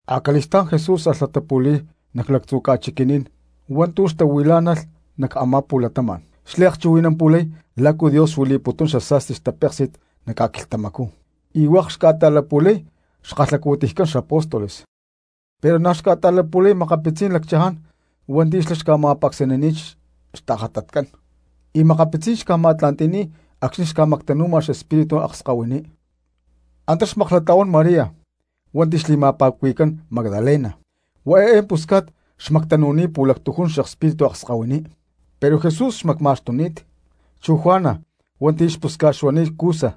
Acali̠stá̠n Jesús alh latapu̠li̠y nac lactzu̠ ca̠chiqui̠ní̠n hua̠ntu̠ xtahuilá̠nalh nac a̠má pu̠latama̠n, xliakchuhui̠nampu̠lay lácu Dios xuili̠putún xasa̠sti xtapéksi̠t nac ca̠quilhtamacú, y hua̠k xca̠ta̠lapu̠lay xkalhacu̠tiycán xapóstoles. Pero na̠ xca̠ta̠lapu̠lay makapitzí̠n lacchaján hua̠nti̠ xlá xca̠ma̠pacsanini̠t xtajatatcán, y makapitzí̠n xca̠ma̠tla̠nti̠ni̠t acxni̠ xca̠mactanu̠ma xespíritu akskahuiní. Antá xmaklatla̠huán María hua̠nti̠ xli̠ma̠pa̠cuhui̠cán Magdalena, huá eé pusca̠t xmactanu̠ni̠t pu̠lactujún xespíritu akskahuiní, pero Jesús xmacma̠xtuni̠t; chu Juana hua̠nti̠ xpusca̠t xuani̠t Cusa,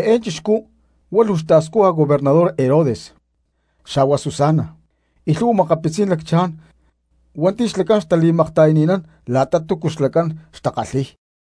eé chixcú huá luu xta̠scuja gobernador Herodes; xa̠hua Susana y lhu̠hua makapitzí̠n lacchaján hua̠nti̠ xlacán xtali̠makta̠yani̠nán la̠ta túcu xlacán xtakalhi̠y.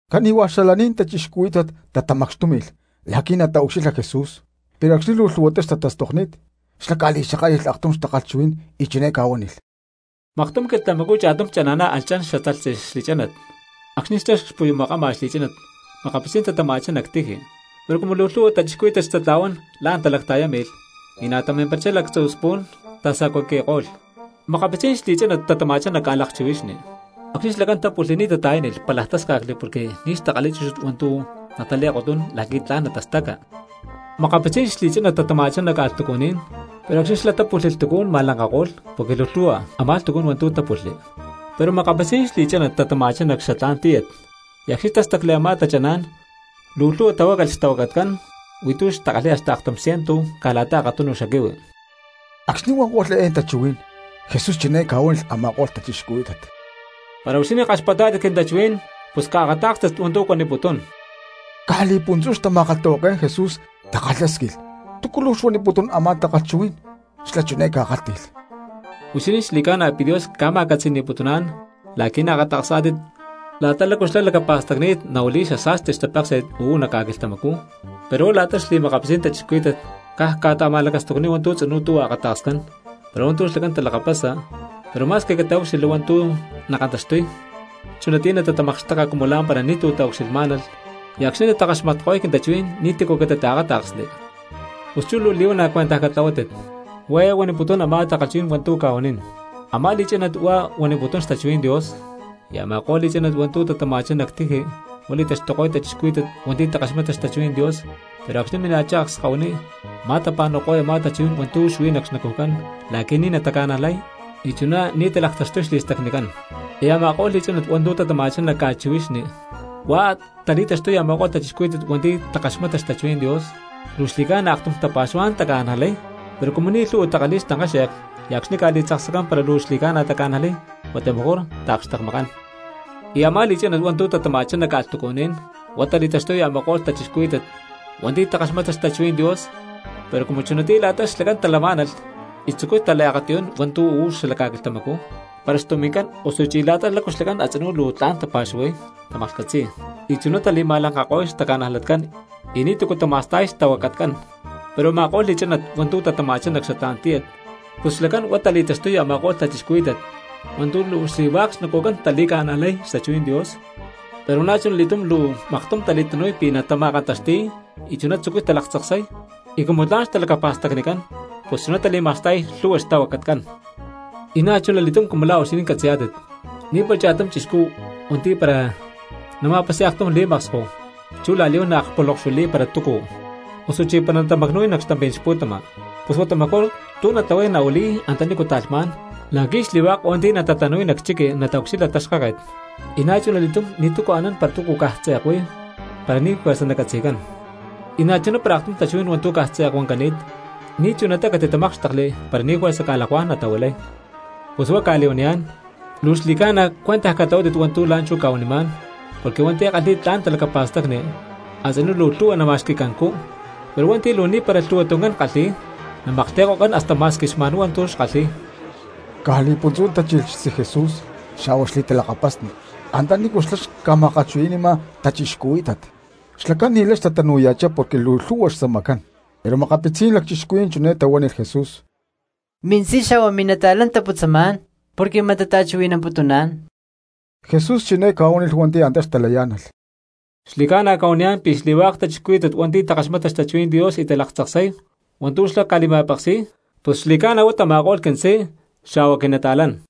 Cani̠hua̠ xalaní̠n cristianos tatamacxtúmi̠lh la̠qui̠ nataucxilha Jesús, pero acxni̠ luu lhu̠huatá xtatastokni̠t xlá ca̠li̠xakátli̠lh aktum takalhchuhuí̠n y chiné ca̠huánilh: —Maktum quilhtamacú cha̠tum chana̠ná alh chan xatalhtzi xli̠chánat. Acxni̠ xlá cxpuyumakama xli̠chánat makapitzí̠n tatama̠chá nac tiji, pero cumu luu lhu̠hua cristianos xtatla̠huán la̠n talacta̠yámi̠lh, y na̠ tamimparachá xlacán lactzu̠ spu̠n tasacuaqui̠ko̠lh. Makapitzí̠n xli̠chánat tatama̠chá nac ca̠lakchihuixni, acxni̠ xlacán tápulhli ni̠ tata̠yánilh pálaj tásca̠cli porque ni̠ xtakalhi̠y chúchut hua̠ntu̠ natali̠kotnún la̠qui̠ tla̠n natastaca. Makapitzí̠n xli̠chánat tatama̠chá nac ca̠lhtucuní̠n, pero acxni̠ xlá pulhli lhtucú̠n ma̠lanka̠ko̠lh porque luu lhu̠hua a̠má lhtucú̠n hua̠ntu̠ tápulhli. Pero makapitzí̠n xli̠chánat tatama̠chá nac xatlá̠n tíyat, y acxni̠ tástacli a̠má tachaná̠n luu lhu̠hua tahuácalh xtahuacatcán, huí tu̠ xkalhi̠y hasta aktum ciento caj la̠ta akatum xaquihui. Acxni̠ huankó̠lh eé tachuhuí̠n Jesús chiné ca̠huánilh a̠ma̠ko̠lh cristianos: —¡Para huixinín kaxpatpá̠tit quintachuhuí̠n pus caakatá̠kstit hua̠ntu̠ cuaniputún! Caj li̠puntzú xtama̠kalhtahuaké̠n Jesús takalhásquilh túcu luu xuaniputún a̠má takalhchuhuí̠n. Xlá chiné ca̠kálhti̠lh: —Huixinín xli̠ca̠na pi̠ Dios ca̠ma̠catzi̠ni̠putuná̠n la̠qui̠ naakata̠ksá̠tit la̠ta lácu xlá lacapa̠stacni̠t nahuili̠y xasa̠sti xtapéksi̠t uú nac ca̠quilhtamacú, pero huá la̠ta xli̠makapitzí̠n cristianos caj cca̠ta̠ma̠lacastucniy hua̠ntu̠ tzinú tuhua akata̠kscán pero hua̠ntu̠ xlacán talakapasa, pero ma̠squi cataúcxilhli hua̠ntu̠ nakantaxtuy chunatiyá natatamakxteka cumu lá̠mpara ni̠tu̠ taucxilhmá̠nalh, y acxni̠ natakaxmatko̠y quintachuhuí̠n ni̠ti̠cu catitaakáta̠ksli. ’Pus chú luu li̠huana̠ cuentaj catlahuátit, huá eé huaniputún a̠má takalhchuhuí̠n hua̠ntu̠ cca̠huanín: Amá li̠chánat huá huaniputún xtachuhuí̠n Dios; y a̠ma̠ko̠lh li̠chánat hua̠ntu̠ tatama̠chá nac tiji huá li̠taxtuko̠y cristianos hua̠nti̠ takaxmata xtachuhuí̠n Dios pero acxni̠ mina̠chá akskahuiní ma̠tapa̠nu̠ko̠y a̠má tachuhuí̠n hua̠ntu̠ xuí nac xnacujcán la̠qui̠ ni̠ nataca̠najlay y chuná ni̠ natalaktaxtuy xli̠stacnicán. Y a̠ma̠ko̠lh li̠chánat hua̠ntu̠ tatama̠chá nac ca̠chihuixni huá tali̠taxtuy a̠ma̠ko̠lh cristianos hua̠nti̠ takaxmata xtachuhuí̠n Dios, luu xli̠ca̠na aktum tapa̠xuhuá̠n taca̠najlay, pero cumu ni̠ lhu̠hua takalhi̠y xtankáxe̠k y acxni̠ ca̠li̠tzaksacán para luu xli̠ca̠na taca̠najlay huata mejor caj taakxtekmakán. Y a̠má li̠chánat hua̠ntu̠ tatama̠chá nac ca̠lhtucuní̠n huá tali̠taxtuy a̠ma̠ko̠lh cristianos hua̠nti̠ takaxmata xtachuhuí̠n Dios, pero cumu chunatiyá la̠ta xlacán talamá̠nalh y tzucuy taliakatiyún hua̠ntu̠ uú xala ca̠quilhtamacú para xtumi̠ncán osuchí la̠ta lácu xlacán a̠tzinú luu tla̠n tapa̠xuhuay tamaklhcatzi̠y, y chuná tali̠ma̠lankako̠y xtaca̠najlatcán y ni̠tu̠cu tama̠sta̠y xtahuacatcán. Pero a̠ma̠ko̠lh li̠chánat hua̠ntu̠ tatama̠chá nac xatlá̠n tíyat pus xlacán huá tali̠taxtuy a̠ma̠ko̠lh cristianos hua̠nti̠ luu xli̠hua̠k xnacujcán tali̠ca̠najlay xtachuhuí̠n Dios, pero na̠chuna li̠túm luu maktum tali̠tanu̠y pi̠ natama̠kantaxti̠y y chuná tzucuy talaktzaksay y cumu tla̠n xtalacapa̠stacnicán pus chuná tali̠ma̠sta̠y lhu̠hua xtahuacatcán. ’Y na̠chuna li̠túm cumu la̠ huixinín catzi̠yá̠tit, ni̠para cha̠tum anán cristiano hua̠nti̠ para la̠ nama̠pasi̠y aktum li̠maksko chú la̠li̠huán naliakpulonkxuili̠y para túcu, osuchí para natama̠cnu̠y nac xtampí̠n xpu̠tama; pus huata mejor tu̠ natlahuay nahuili̠y antanícu ta̠lhmá̠n la̠qui̠ xli̠hua̠k hua̠nti̠ natatanu̠y nac chiqui nataucxilha taxkáket. Y na̠chuna li̠túm ni̠tu̠cu anán para túcu caj tze̠k huí para ni̠ juerza nacatzi̠cán, y na̠chuná para aktum tachuhuí̠n hua̠ntu̠ caj tze̠k huancani̠t ni̠ chunatá catitamákxtekli para ni̠ juerza ca̠lakuá̠n natahuilay. ’Pus huá cca̠li̠huaniyá̠n, luu xli̠ca̠na cuentaj catlahuátit hua̠ntu̠ la̠nchú cca̠huanimá̠n porque hua̠nti̠ kalhi̠y tla̠n talacapa̠stacni a̠tzinú luu lhu̠hua nama̠xqui̠cancú, pero hua̠nti̠ luu ni̠para lhu̠hua tuncán kalhi̠y, namaklhti̠ko̠cán hasta ma̠squi xma̠nhuá hua̠ntu̠ xlá kalhi̠y. Caj li̠puntzú tachilh xtzí Jesús xa̠hua xli̠talakapasni antanícu xlá xca̠ma̠kalhchuhui̠ni̠ma cristianos, xlacán ni̠lay xtatanu̠ya̠chá porque luu lhu̠hua xtzamacán. Pero makapitzí̠n cristianos chiné tahuánilh Jesús: —Mintzí xa̠hua mili̠talakapasni taputzamá̠n porque mat tata̠chuhui̠namputuná̠n. Jesús chiné ca̠huánilh hua̠nti̠ antá xtalayá̠nalh: —Xli̠ca̠na cca̠huaniyá̠n pi̠ xli̠hua̠k cristianos hua̠nti̠ takaxmata xtachuhuí̠n Dios y talaktzaksay hua̠ntu̠ xlá ca̠li̠ma̠peksi̠y, pus xli̠ca̠na huá tama̠ko̠lh quintzí xa̠hua quinata̠lán.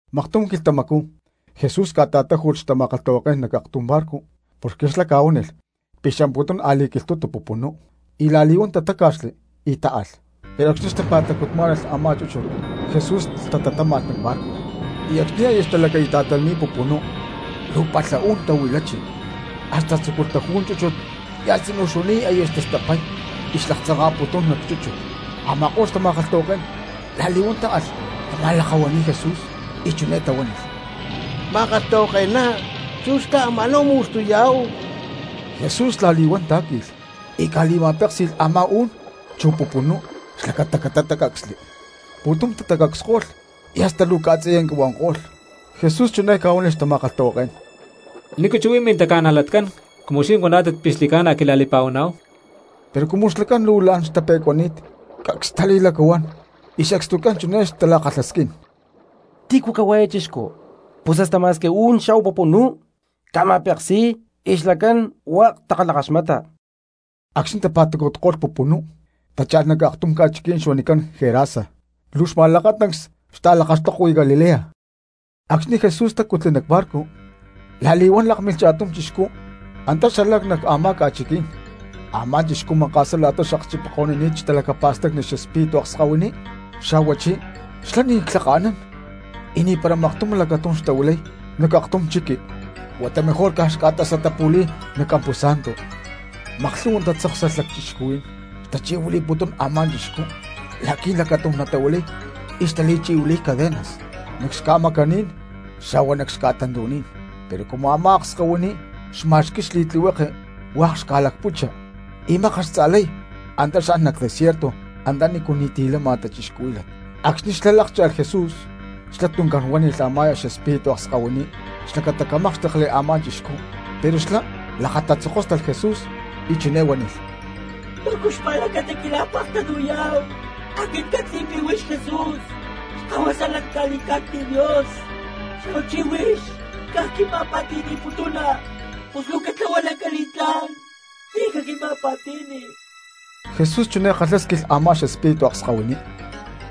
Maktum quilhtamacú Jesús ca̠ta̠táju̠lh xtama̠kalhtahuaké̠n nac aktum barco porque xlá ca̠huánilh pi̠ xamputún a̠li̠quilhtu̠tu pupunú, y la̠li̠huán tatáca̠xli y táalh. Pero acxni̠ xtapa̠tacutmá̠nalh a̠má chúchut Jesús lhtatatáma̠lh nac barco. Y acxni̠ aya xtalaquita̠tlani̠t pupunú luu palha u̠n tahuilachi hasta tzúculh taju̠y chúchut y a̠tzinú xuani̠t aya xtastapay y xlaktzanka̠putún nac chúchut. Ama̠ko̠lh xtama̠kalhtahuaké̠n la̠li̠huán táalh tama̠lakahua̠ni̠y Jesús y chiné tahuánilh: —¡Ma̠kalhtahuake̠ná, chú xlá ama̠náhu mu̠xtuyá̠hu! Jesús la̠li̠huán tá̠qui̠lh y ca̠li̠ma̠péksi̠lh a̠má u̠n chu pupunú xlacata catácacsli; pu̠tum tacacsko̠lh y hasta luu ca̠tziyanca huanko̠lh. Jesús chiné ca̠huánilh xtama̠kalhtahuaké̠n: —¿Nícu chú huí mintaca̠najlatcán cumu huixinín huaná̠tit pi̠ xli̠ca̠na quila̠li̠pa̠huaná̠hu? Pero cumu xlacán luu la̠n xtape̠cuaxni̠ni̠t, cacs xtali̠lacahuán y sacstucán chiné xtala̠kalhasquín: —¿Tícu cahuá eé chixcú? Pus hasta ma̠squi u̠n xa̠hua pupunú ca̠ma̠peksi̠y y xlacán hua̠k takalhakaxmata. Acxni̠ tapa̠tacutko̠lh pupunú tácha̠lh nac aktum ca̠chiquí̠n huanicán Gerasa, luu xma̠lakatancs xta̠lakaxtokui Galilea. Acxni̠ Jesús tacutli nac barco la̠li̠huán lákmilh cha̠tum chixcú antá xalá nac a̠má ca̠chiquí̠n. Amá chixcú maka̠sá la̠ta xakchipaniko̠ni̠t xtalacapa̠stacni xespíritu akskahuiní, xa̠huachí xlá ni̠ clhaka̠nán y ni̠para maktum lacatum xtahuilay nac aktum chiqui huata mejor caj xca̠tasatapu̠li̠y nac ca̠púsa̠ntu. Maklhu̠hua tatzáksalh cristianos xtachi̠huili̠putún a̠má chixcú la̠qui̠ lacatum natahuilay y xtali̠chi̠huili̠y cadenas nac xca̠macaní̠n xa̠hua nac xca̠tantu̠ní̠n, pero cumu a̠má akskahuiní xma̠xqui̠y xli̠tlihueke hua̠k xca̠lacputxa y mákat xtza̠lay antá xan nac desierto antanícu ni̠ti̠ lama cristianos. Acxni̠ xlá lákcha̠lh Jesús xlá tuncán huánilh a̠má xespíritu akskahuiní xlacata camákxtekli a̠má chixcú, pero xlá lakatatzokóstalh Jesús y chiné huánilh: —¿Túcu xpa̠lacata quila̠pektanu̠yá̠hu? Aquit ccatzi̠y pi̠ huix Jesús xkahuasa lanca li̠cá̠cni̠t Dios, xa̠huachí huix caj quima̠pa̠ti̠ni̠putuna. Pus luu catlahua lanca li̠tlá̠n ni̠ caquima̠pa̠ti̠ni. Jesús chiné kalhásquilh a̠má xespíritu akskahuiní: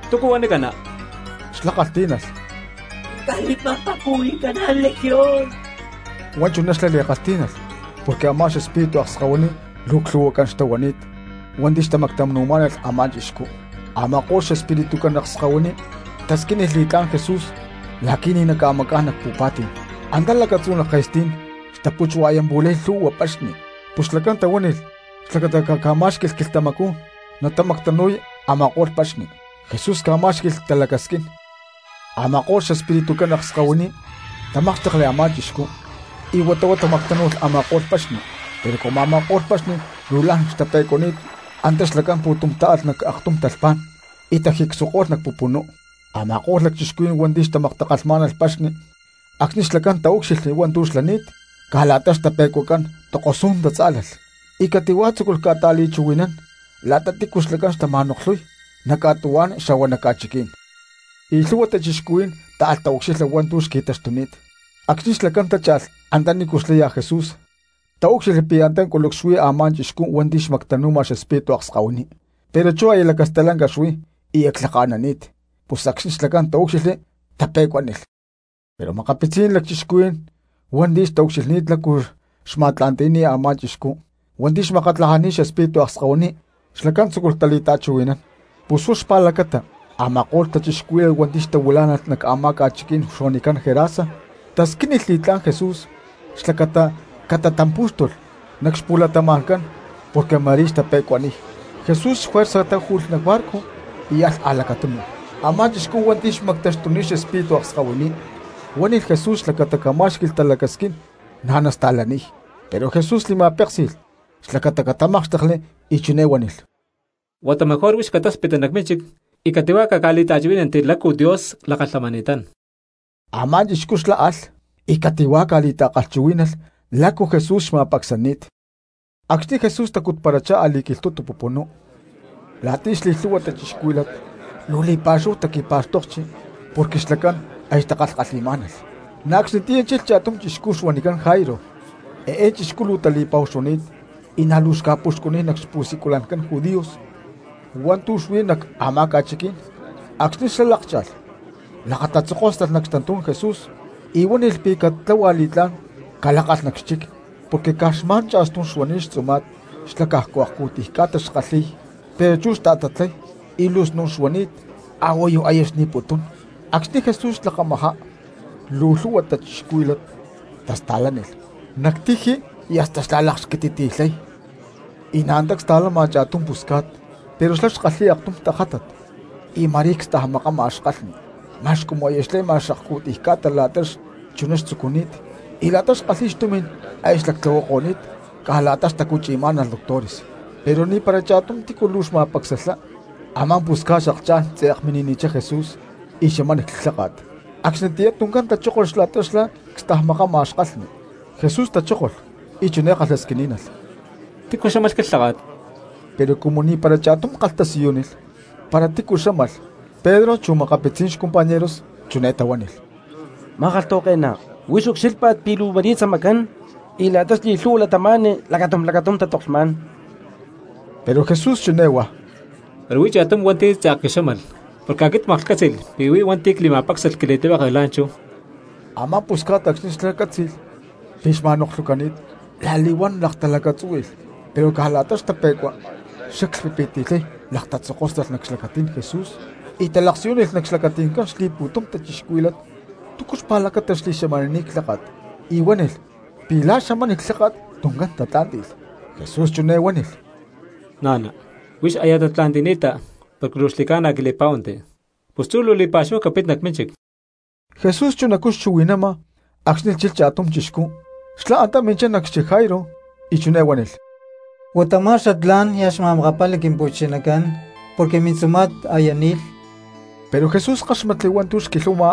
—¿Túcu huanicana? Xlá kalhtí̠nalh: —Quinca̠li̠ma̠pa̠cuhui̠caná̠n Legión. Huá chuná xlá li̠kalhtí̠nalh porque a̠má xespíritu akskahuiní luu clhu̠huacán xtahuani̠t hua̠nti̠ xtamactanu̠má̠nalh a̠má chixcú. Ama̠ko̠lh xespiritucán akskahuiní tasquínilh li̠tlá̠n Jesús la̠qui̠ ni̠ naca̠macá̠n nac pu̠pa̠tí̠n. Antá lacatzú nac ke̠stí̠n xtaputswa̠yantla̠huán lhu̠hua paxni, pus xlacán tahuánilh xlacata caca̠má̠xqui̠lh quilhtamacú natamactanu̠y a̠ma̠ko̠lh paxni. Jesús ca̠má̠xqui̠lh talacasquín. Ama̠ko̠lh xespiritucán akskahuiní tamákxtekli a̠má chixcú y huata huá tamactánu̠lh a̠ma̠ko̠lh paxni. Pero cumu a̠ma̠ko̠lh paxni luu la̠n tape̠cuáxni̠lh antá xlacán pu̠tum táalh nac aktum talhpá̠n y tajicsuako̠lh nac pupunú. Ama̠ko̠lh lacchixcuhuí̠n hua̠nti̠ xtamaktakalhmá̠nalh paxni acxni̠ xlacán taúcxilhli hua̠ntu̠ xlani̠t, caj la̠ta xtape̠cuacán tokosú̠n tatzá̠lalh y cati̠huá tzúculh tata̠li̠chuhui̠nán la̠ta tícu xlacán xtama̠noklhuy nac ca̠tuhuá̠n xa̠hua nac ca̠chiquí̠n. Y lhu̠hua cristianos táalh taucxilha hua̠ntu̠ xqui̠taxtuni̠t. Acxni̠ xlacán tácha̠lh antanícu xlaya Jesús taúcxilhli pi̠ antá culucs xuí a̠má chixcú hua̠nti̠ xmactanu̠ma xespíritu akskahuiní; pero chú aya lacastalanca xuí y clhaka̠nani̠t. Pus acxni̠ xlacán taúcxilhli tape̠cuánilh. Pero makapitzí̠n lacchixcuhuí̠n hua̠nti̠ xtaucxilhni̠t lácu xma̠tla̠nti̠cani̠t a̠má chixcú hua̠nti̠ xmakatlajani̠t xespíritu akskahuiní, xlacán tzúculh tali̠ta̠chuhui̠nán. Pus huá xpa̠lacata a̠ma̠ko̠lh cristianos hua̠nti̠ xtahuilá̠nalh nac a̠má ca̠chiquí̠n huanicán Gerasa tasquínilh li̠tlá̠n Jesús xlacata catatampú̠xtulh nac xpu̠latama̠ncán porque ma̠rí xtape̠cuaniy. Jesús juerza táju̠lh nac barco y alh a̠lacatunu. Amá chixcú hua̠nti̠ xmactaxtuni̠t xespíritu akskahuiní huánilh Jesús xlacata camá̠xqui̠lh talacasquín na̠ nasta̠laniy, pero Jesús li̠ma̠péksi̠lh xlacata catamákxtekli y chiné huánilh: —Huata mejor huix catáspitti nac mínchic y cati̠huá caca̠li̠ta̠kalhchuhuí̠nanti lácu Dios lakalhamani̠tán. Amá chixcú xlá alh y cati̠huá ca̠li̠ta̠kalhchuhuí̠nalh lácu Jesús xma̠pacsani̠t. Acxni̠ Jesús tacutparachá a̠li̠quilhtu̠tu pupunú la̠ta xli̠lhu̠hua cristianos, luu li̠pa̠xúhu taqui̠pá̠xtokli porque xlacán aya xtakalhi̠má̠nalh. Na̠ acxnitiyá chilh cha̠tum chixcu xuanicán Jairo, eé chixcú luu tali̠pa̠hu xuani̠t y na̠ luu xca̠puxcuniy nac xpu̠siculancán judíos hua̠ntu̠ xuí nac a̠má ca̠chiquí̠n. Acxni̠ xlá lákcha̠lh, lakatatzokóstalh nac xtantú̠n Jesús y huánilh pi̠ catláhualh li̠tlá̠n calákalh nac xchic, porque xuí caj xma̠n cha̠stum xtzuma̠t xlá cajcu akcu̠tiy ca̠ta xkalhi̠y pero chú xta̠tatlay y luu snu̠n xuani̠t a̠huayu aya xni̠putún. Acxni̠ Jesús xlakamajá, luu lhu̠hua cristianos tasta̠lánilh nac tiji y hasta xtala̠lakxquititi̠lhay. Y na̠ antá csta̠lama cha̠tum pusca̠t, pero xlá xkalhi̠y aktum tajátat y ma̠rí cstajmakama kalhni ma̠x cumu aya xle̠ma xliakcu̠tiy ca̠ta la̠ta xlá chuná xtzucuni̠t, y la̠ta xkalhi̠y xtumi̠n aya xlactlahuami̠ko̠ni̠t caj la̠ta xtacuchi̠má̠nalh doctores; pero ni̠para cha̠tumá tícu luu xma̠pacsalhá. Amá pusca̠t xaklhchá̠n tze̠k mini̠nichá Jesús y xamánilh clháka̠t, acxnitiyá tuncán tachókolh la̠ta xlá cstajmakama kalhni. Jesús tachókolh y chiná kalhasquiní̠nalh: —¿Tícu xámalh quilháka̠t? Pero cumu ni̠para cha̠tum kalhtasiyúnilh para tícu xámalh, Pedro chu makapitzí̠n xcompañeros chiné tahuánilh: —Ma̠kalhtahuake̠ná, huix ucxílhpa̠t pi̠ luu ma̠rí tzamacán y la̠ta xli̠lhu̠hua cristianos lacatum lacatum tatoklhmá̠n. Pero Jesús chiné huá: —Pero huí cha̠tum hua̠nti̠ tze̠k quixámalh porque aquit tla̠n cmaklhcátzi̠lh pi̠ huí hua̠nti̠ cli̠ma̠pácxalh quili̠tlihueke la̠nchú. Amá pusca̠t acxni̠ xlá cátzi̠lh pi̠ xma̠noklhucani̠t la̠li̠huán laktalacatzúhui̠lh, pero caj la̠ta xtape̠cua xlá clhpipiti̠lhay lakatatzokóstalh nac xlacatí̠n Jesús y talaksiyúnilh nac xlacati̠ncán xli̠pu̠tum cristianos túcu xpa̠lacata xli̠xamanini̠t clháka̠t; y huánilh pi̠ la̠ xamánilh clháka̠t tuncán tatlá̠nti̠lh. Jesús chiné huánilh: —Na̠na, huix aya tatla̠nti̠ni̠ta porque luu xli̠ca̠na quili̠pá̠huanti, pus chú luu li̠pa̠xúhu capit nac mínchic. Jesús chunacú xchuhui̠nama acxni̠ chilh cha̠tum chixcú xlá antá minchá nac xchic Jairo, y chiné huánilh: —Huata ma̠x xatlá̠n niaj xma̠makapali Quimpu̠chinacán, porque mintzuma̠t aya ni̠lh. Pero Jesús káxmatli hua̠ntu̠ xquilhuama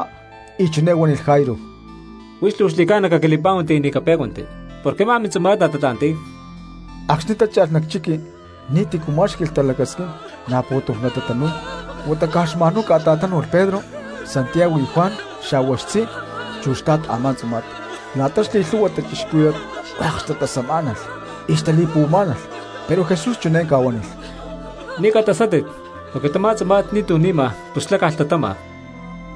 y chiné huánilh Jairo: —Huix luu xli̠ca̠na caquili̠pá̠huanti y ni̠ capé̠cuanti, porque a̠má mintzuma̠t natatla̠nti̠y. Acxni̠ tácha̠lh nac chiqui ni̠ti̠cu má̠xqui̠lh talacasquín na̠ pu̠tum tatanu̠y huata caj xma̠nhuá catatánu̠lh Pedro, Santiago y Juan xa̠hua xtzí chu xtla̠t a̠má tzuma̠t. La̠ta xli̠lhu̠hua cristianos hua̠k xtatasamá̠nalh y xtali̠puhuamá̠nalh, pero Jesús chiné ca̠huánilh: —Ni̠ catasátit, porque tamá tzuma̠t ni̠tu̠ ni̠ma pus xlá caj lhtatama.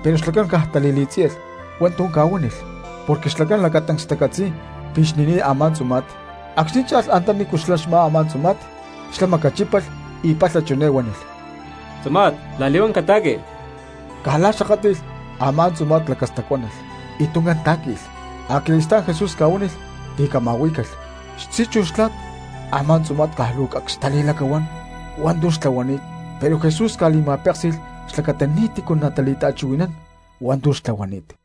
Pero xlacán caj tali̠li̠tzíyalh hua̠ntu̠ ca̠huánilh porque xlacán lacatancs xtacatzi̠y pi̠ xni̠ni̠t a̠má tzuma̠t. Acxni̠ cha̠lh antanícu xlá xmá a̠má tzuma̠t, xlá macachípalh y palha chiné huánilh: —¡Tzuma̠t, la̠li̠huán cata̠qui! Caj la̠ xakátli̠lh, a̠má tzuma̠t lacastacuánalh y tuncán tá̠qui̠lh. Acali̠stá̠n Jesús ca̠huánilh pi̠ cama̠huí̠calh. Xtzí chu xtla̠t a̠má tzuma̠t caj luu cacs xtali̠lacahuán hua̠ntu̠ xtlahuani̠t, pero Jesús ca̠li̠ma̠péksi̠lh xlacata ni̠ti̠cu natali̠ta̠chuhui̠nán hua̠ntu̠ xlá xtlahuani̠t.